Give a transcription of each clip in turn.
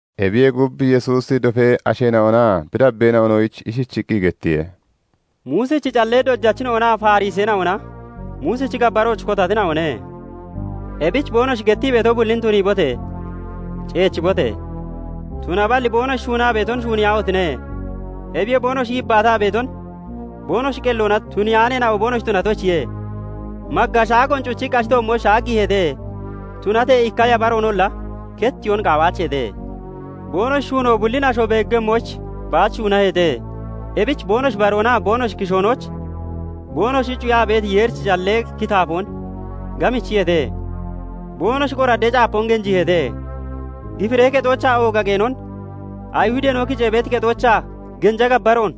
Ebiyee gub, Yesuusi dofee asheena'onaa bi dabbeena'onoyich ishichiqqi gettiye; "Muusichi callee dojachina'onaa Fariseena'ona Muusichi gabbarooch kotatina'one. Ebich boonoshi gettii beeto bullin tuniibote! Ceechibote! Tunaballi boonoshi shuunaa beeton shuuniyaahotine! Ebiyoo boonoshi yibbaataa beeton boonoshi qelloona tuniyaaneena'o boonoshi tunatoyichiye. Magga shaagoon cuchiqqi ashi toommooch shaaggiiheete; tunatee ikka yaphareenolla kettiyoon qaawaacheete. "Boonoshi shuunoo bullin asho beeggemmoyich baach shuunaheete. Ebich boonoshi baroonaa boonoshi kishoonooch boonoshi cuyaa beeti Yeerichi callee kitaafoon gamichiyeete; boonoshi qoraddee caapoon genjiiheete; gifiree kexoochaa ooga qeenon, Ayihudeena'o kicee beeti kexoochaa genja gabbaroon,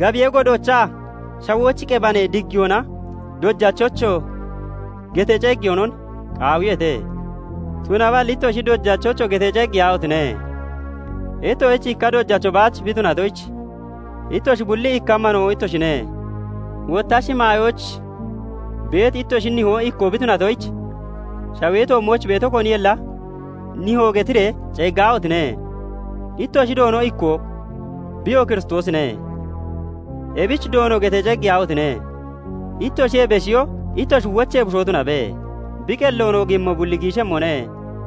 Gabiyee godoochaa shawooch qebanee diggiyoonaa 'Dojachocho!' getee ceeggeyoonon qaawiyeete. "Tunaballi ittoshi 'Dojacho' getee ceeggeyaahotine! Ittoshich ikka dojacho baach bi beetoyich, ittoshi bulli ikka manoo ittoshine. Wotta shimaayooch beeti ittoshi nihoo ikkoo bi tunatoyich, shawee toommooch beeto koninolla 'Nihoo' getiree ceeggaahotine! Ittoshi Doono ikkoo, biyoo Kiristoosine; ebichi 'Doono' getee ceeggeyaahotine! Ittoshiyee beshiyo ittoshi wochee bushoo tunabe. Bi qelloon oogiimmo bulli giishemmone;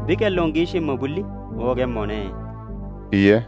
bi qelloon giishiimmo bulli oogemmone" iye.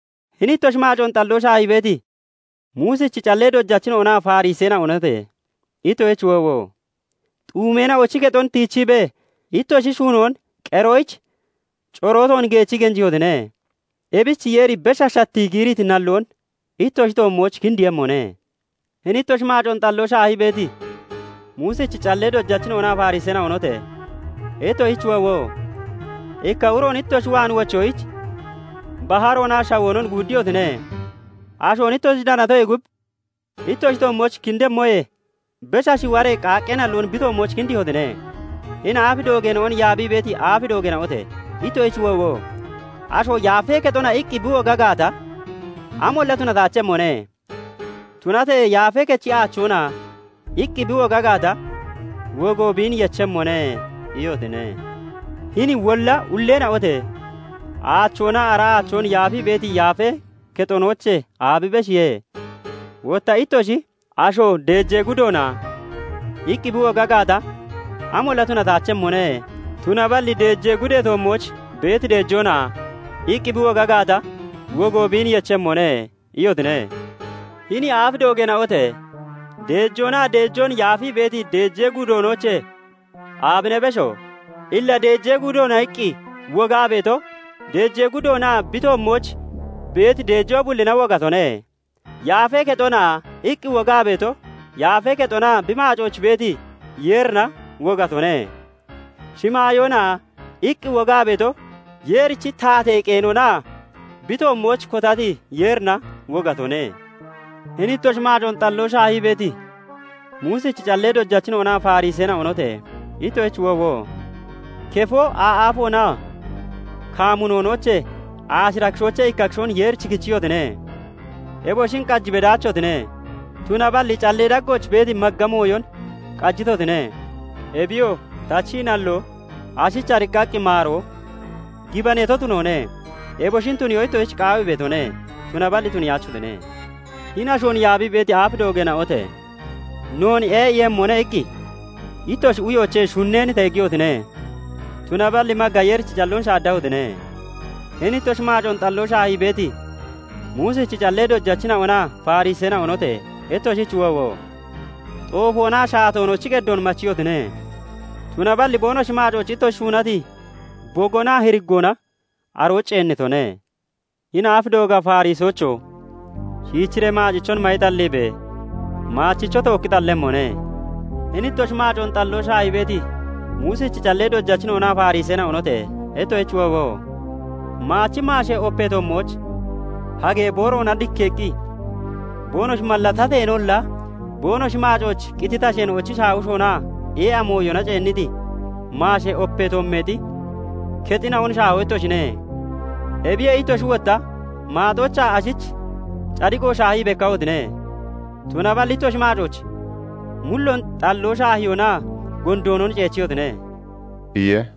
[Hini ittoshi maacoon xalloo shaahii beeti Muusichi callee dojachina'onaa Fariseena'onote! Ittoshich woowo! Xuumeena'ochi kexon tiichiibee ittoshi shuunoon qeroyich corooton geechii geenjiihotine. Ebich Yeeri besha shattii giiriti nalloon ittoshi toommooch kindiiyemmone.] "Hini ittoshi maacoon xalloo shaahii beeti Muusichi callee dojachina'onaa Fariseena'onote! Ittoshich woowo! Ikka uroon ittoshi waan wochoyich baharoonaa shawoonon guuddiyotine. Ashoon ittoshi danatoyee gub ittoshi toommooch kindemmoyee besha shiwaree qaaqqee nalloon bi toommooch kindiihotine. "Hini aaf doogeena'on yaabii beeti aaf doogeena'ote! ittoshich woowo! 'Asho "Yaafee kexona!" iqqi bi woga gaata, 'Amolla tunataachemmone; tunatee "Yaafee Kechi aachoona!" iqqi bi woga gaata, wogo biin yechemmone' iyotine. Hini wolla ulleena'ote! Aachoonaa ara aachoon yaafii beeti yaafee kexonoochee aabi beshiye? Wotta ittoshi 'Asho "Deejee gudoona!" iqqi bi woga gaata, amolla tunataachemmone; tunaballi "Deejee gudee toommooch beeti deejoona!" iqqi bi woga gaata, wogo biin yechemmone' iyotine. Hini aaf doogeena'ote! Deejoonaa deejoon yaafii beeti deejee gudoonoochee aabine besho? Illa 'Deejee gudoona!' iqqi wogaa beeto, deejee gudoonaa bi toommooch beeti deejoo bullina wogatone. 'Yaafee kexona!' iqqi wogaa beeto, yaafee kexonaa bi maacooch beeti Yeerina wogatone. 'Shimaayoona!' iqqi wogaa beeto, Yeerichi taatee qeenonaa bi toommooch kotati Yeerina wogatone. "Hini ittoshi maacoon xalloo shaahii beeti Muusichi callee dojachina'onaa Fariseena'onote! Ittoshich woowo! Kefoo, aa'aafoonaa kamunonoochee aashira kishoochee ikka kishoon Yeerich kichiyotine; eboshin qaji bedaachotine; tunaballi callee daggooch beeti magga mooyon qajitotine; eboyoo tachii nalloo, ashich ariqqaqqi maaroo, gibaneeto tunoone; eboshin tuniyoo ittoshich qaawii beetone; tunaballi tuniyaachotine. Hini ashoon yaabii beeti aaf doogeena'ote! 'Noon ee'iiyemmone' iqqi ittoshi uyoochee shunneen teegiyotine; tunaballi magga Yeerichi calloon shaaddahotine. "Hini ittoshi maacoon xalloo shaahii beeti Muusichi callee dojachina'onaa Fariseena'onote! Ittoshich woowo! Xoofoonaa shaatoonochi qeddoon machiyotine; tunaballi boonoshi maacooch ittoshi shuunati bogoonaa hiriggoona arooch ceennitone. Hini aaf dooga Farisoocho! Shiichiree maacichon mayi xalliibe! Maachichoo tookki xallemmone. "Hini ittoshi maacoon xalloo shaahii beeti Muusichi callee dojachina'onaa Fariseena'onote! Ittoshich woowo! Maachi maashee opee toommooch hagee booroona dikkeeqqi boonoshi mallatateenolla, boonoshi maacooch qititi asheena'ochi shaawishonaa ee'a mooyona ceenniti maashee opee toommeexi kexina'on shaaho ittoshine. Ebiyee ittoshi wotta maaxoochaa ashich cadiqo shaahii bekkahotine; tunaballi ittoshi maacooch mulloon xalloo shaahiyoonaa gondoonon ceechiyotine" iye.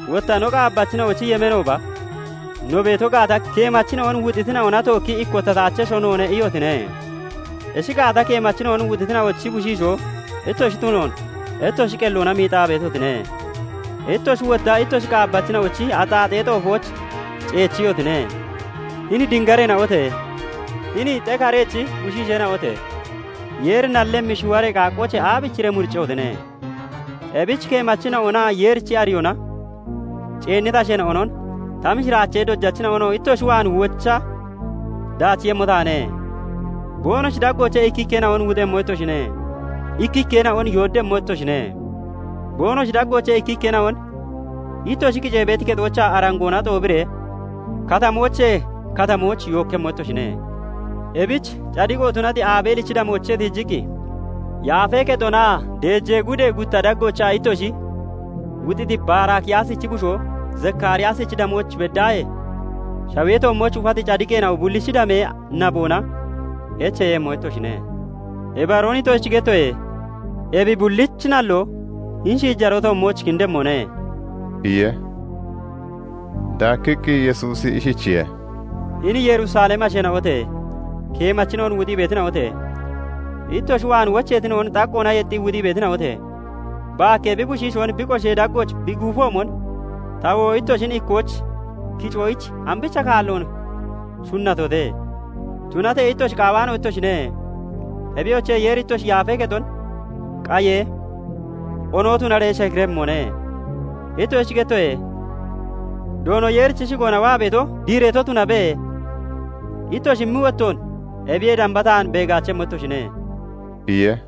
Wotta 'No qaabbachina'ochi yemeenooba no beeto gaata, keemachina'on wuxitina'ona tookki ikkotataachesho noone' iyotine. Ishi gaata, keemachina'on wuxitina'ochi bushiishoo ittoshi tunoon ittoshi qelloona miixaa beetotine. Ittoshi wotta ittoshi qaabbachina'ochi axaaxee xoofooch ceechiyotine. "Hini dingareena'ote! Hini xekarechi bushiisheena'ote! Yeeri nallemmi shiwaree qaaqqoochee aabichiree muriccehotine? Ebich keemachina'onaa Yeerichi ariyoona ceenniti asheena'onon, ta mishiraachee dojachina'onoo ittoshi waan wocha daachiiyemmo taane. Boonoshi daggoochee ikkikkeena'on wuxemmo ittoshine; ikkikkeena'on yooddemmo ittoshine; boonoshi daggoochee ikkikkeena'on ittoshi kicee beeti kexoochaa arangoona xoobiree katamoochee katamooch yookkemmo ittoshine. Ebich cadiqo tunati Abeelichi damoochee tiijiqqi, yaafee kexonaa deejee gudee gutta daggoochaa ittoshi wuxiti Baraakiyaasichi bushoo Zakaariyaasichi damooch beddaahee, shawee toommooch ufati cadiqeena'o bullichi damee naboona echeeyemmo ittoshine. Ibaroon ittoshich gettoye; ebi bullichi nalloo hini shiijaroo toommooch kindemmone" iye. Daakkiqqi Yesuusi ishichiye:- "Hini Yerusalemi asheena'ote! Keemachina'on wuxii beetina'ote! ittoshi waan wocheetina'on xaqqoona yexxii wuxii beetina'ote! Baakkee bi bushiishoon bi qoshee daggooch bi guufoomon, tawoo ittoshin ikkooch kicoyich ambicha kaalloon shunatote! Tunatee ittoshi qaawaano ittoshine. Ebiyoche! Yeeri ittoshi yaafee kexon qayee, onoo tunaree shekiremmone. Ittoshich gettoye; 'Doono Yeerichi shigoona waa beeto diireeto tunabe' ittoshi immi wottoon ebiyee damba taan beegaachemmo ittoshine" iye.